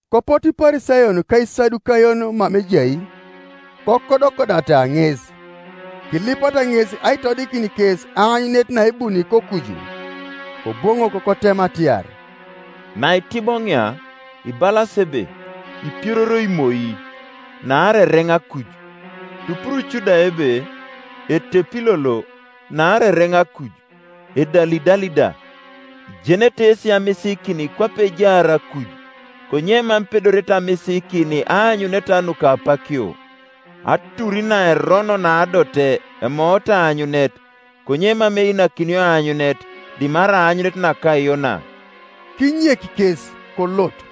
Kopotu Iparisayon ka Isadukayon mama ejai, kokodokodata ŋes, kilipata ŋes aitodikin kes aanyunet naebuni kokuju, Koboŋok kotema atiar, “Naitiboŋia, ibalas ebe, ‘Ipiororoi moi, naarai ereŋ akuj.’ Tupuruc da ebe, ‘Etepi lolo, naarai ereŋ akuj, edalidali da.’ Ijenete yesi amisiikin kwape ejaar akuj, konye mam ipedorete amisiikin aanyuneta nuka apakio. Atur naerono naadote emoot aanyunet, konye mam einakinio aanyunet, dimarai aanyunet naka Yona.” Kinyek kes, kolot.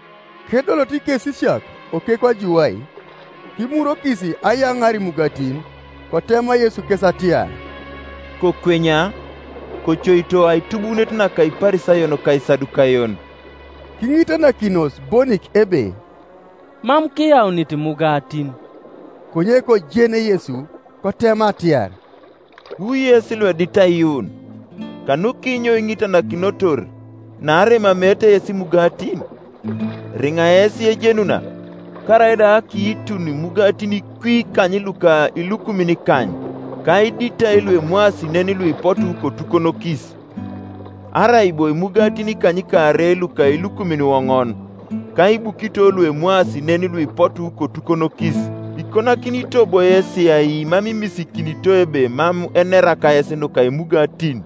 Kedoloto ikesisiak okekwa juwai, kimurwokis ayaŋaar imugatin. Kotema Yesu kes atiar, “Kokwenya, kocoito aitubuunet naka Iparisayon ka Isadukayon.” Kiŋitanakinos bonik ebe, “Mam kiyaunit imugatin.” Konye kojen Yesu, kotema atiar, “Wu yes luedit aiyuun, kanukinyo iŋitanakinotor, naarai emameete yes imugatin? Eriŋa yes ejenuna? Karaida akiitun imugatin kwi ikany luka ilukumin ikany, ka iditai luemwaasi nen Iuipotu kotukonokis? Arai bo imugatin ikanykaarei luka ilukumin iwoŋon, ka ibukito luemwaasi nen luipotu kotukonokis? Ikonakinito bo yesi ai mam imisiikinito ebe mam enera kayes nuka imugatin?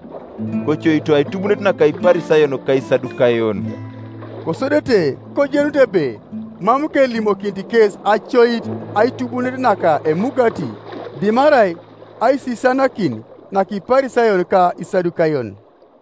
Kocoito aitubuunet naka Iparisayon ka Isadukayon.” Kosodete kojenut ebe mam kelimokinit kes acoit aitubuunet naka emugati, dimarai aisisianakin naka Iparisayon ka Isadukayon.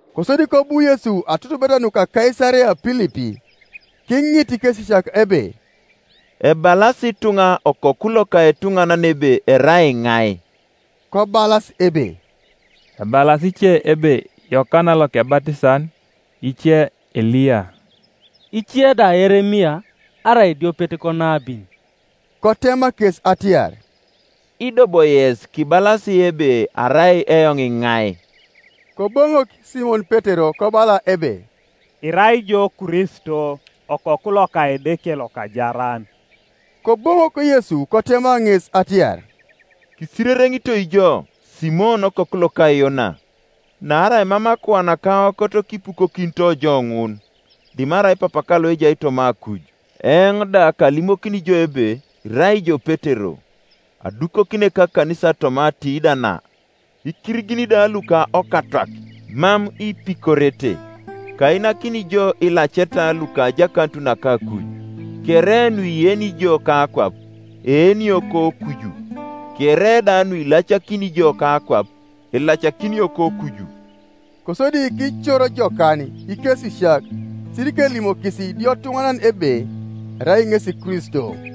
Kosodi kobu Yesu atutubeta nuka Kaisarea Pilipi, kiŋit ikekesisiak ebe, “Ebalas ituŋa Okoku loka etuŋanan ebe erai iŋai?” Kobalas ebe, “Ebalas ice ebe Yokana Lokebatisan, ice Eliya, ice da Yeremia arai ediopet konabin.” Kotema kes atiar, “Ido bo yes kibalas ebe arai eoŋ iŋai?” Koboŋok Simon Petero kobala ebe, “Irai ijo Kristo, Okoku loka Edeke lokajaran.” Koboŋok Yesu kotema ŋes atiar, “Kisirereŋitoi jo, Simon okoku loka Yona! Naarai mam akuan ka aokot kipukokinito jo ŋun, dimarai Papaka loejai toma akuj. Eoŋ da kalimokini jo ebe irai ijo Petero, adukokini ekakanisa toma atiida na, ikirigin da luka okatwak mam ipikorete. Kainakini jo ilaceta luka ajakanut naka akuj, kere nuieni ijo kakwap, eenio kokuju, kere da nuilacakini ijo kakwap, elacakinio kokuju.” Kosodi kicor jokan ikesisiak sirikelimokis idiotuŋanan ebe erai ŋesi Kristo.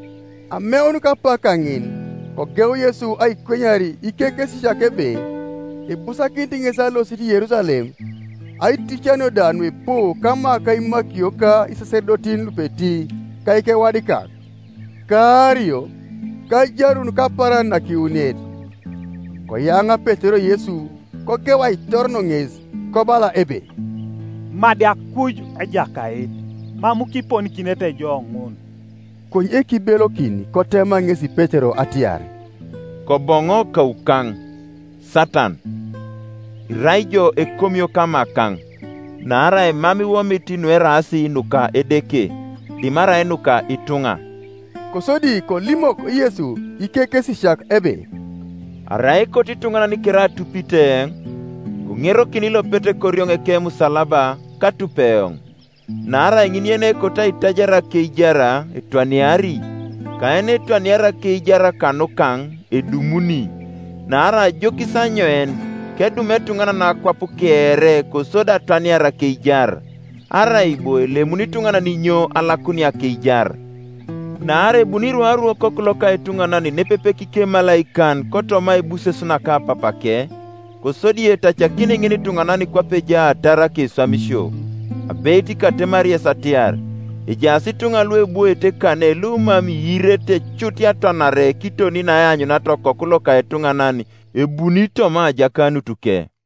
Ameun kapak kaŋin kogeu Yesu aikwenyar ikekesisiak ebe ibusakinit ŋes alosit Yerusalem, aiticanio da nuipu kama ka imakio ka isasedotin lupeti ka ikewadikak, ka aario, ka ajarun kapaaran nakiwuniet. Koyaŋa Petero Yesu, kogeu aitoron ŋes, kobala ebe, “Madi akuj, Ejakait! Mam kiponikinete jo ŋun.” Konye kibelokin kotema ŋesi Petero atiar, “Koboŋo kaukaŋ, Satan! Irai ijo ekomio kamakaŋ; naarai mam iwomit nueraas nuka Edeke, dimarai nuka ituŋa.” Kosodi kolimok Yesu ikekesisiak ebe, “Arai ekoto ituŋanan kere atupit eoŋ, koŋerokin ilopet korioŋ ekemusalaba, katup eoŋ. Naarai ŋin yenekoto aitajar akeijar etwaniari, ka yenetwaniari akeijar kanukaŋ edumuni. Naarai ajokis anyoin kedum etuŋanan akwap kere kosodi atwaniar akeijar? Arai bo elemuni ituŋanan inyo alakunia akeijar? Naarai ebuni rwaru Okoku loka etuŋanan nepepe kikemalaikan kotoma aibuses naka Papake, kosodi etacakini ŋinituŋanan kwape ejaatar akeswamisio. Abeit katemari yes atiar, ejaas ituŋa luebwoete kane lumam iirete cut atwanare kiton naeanyuniata Okoku loka etuŋanan ebuni toma ajakanutuke.”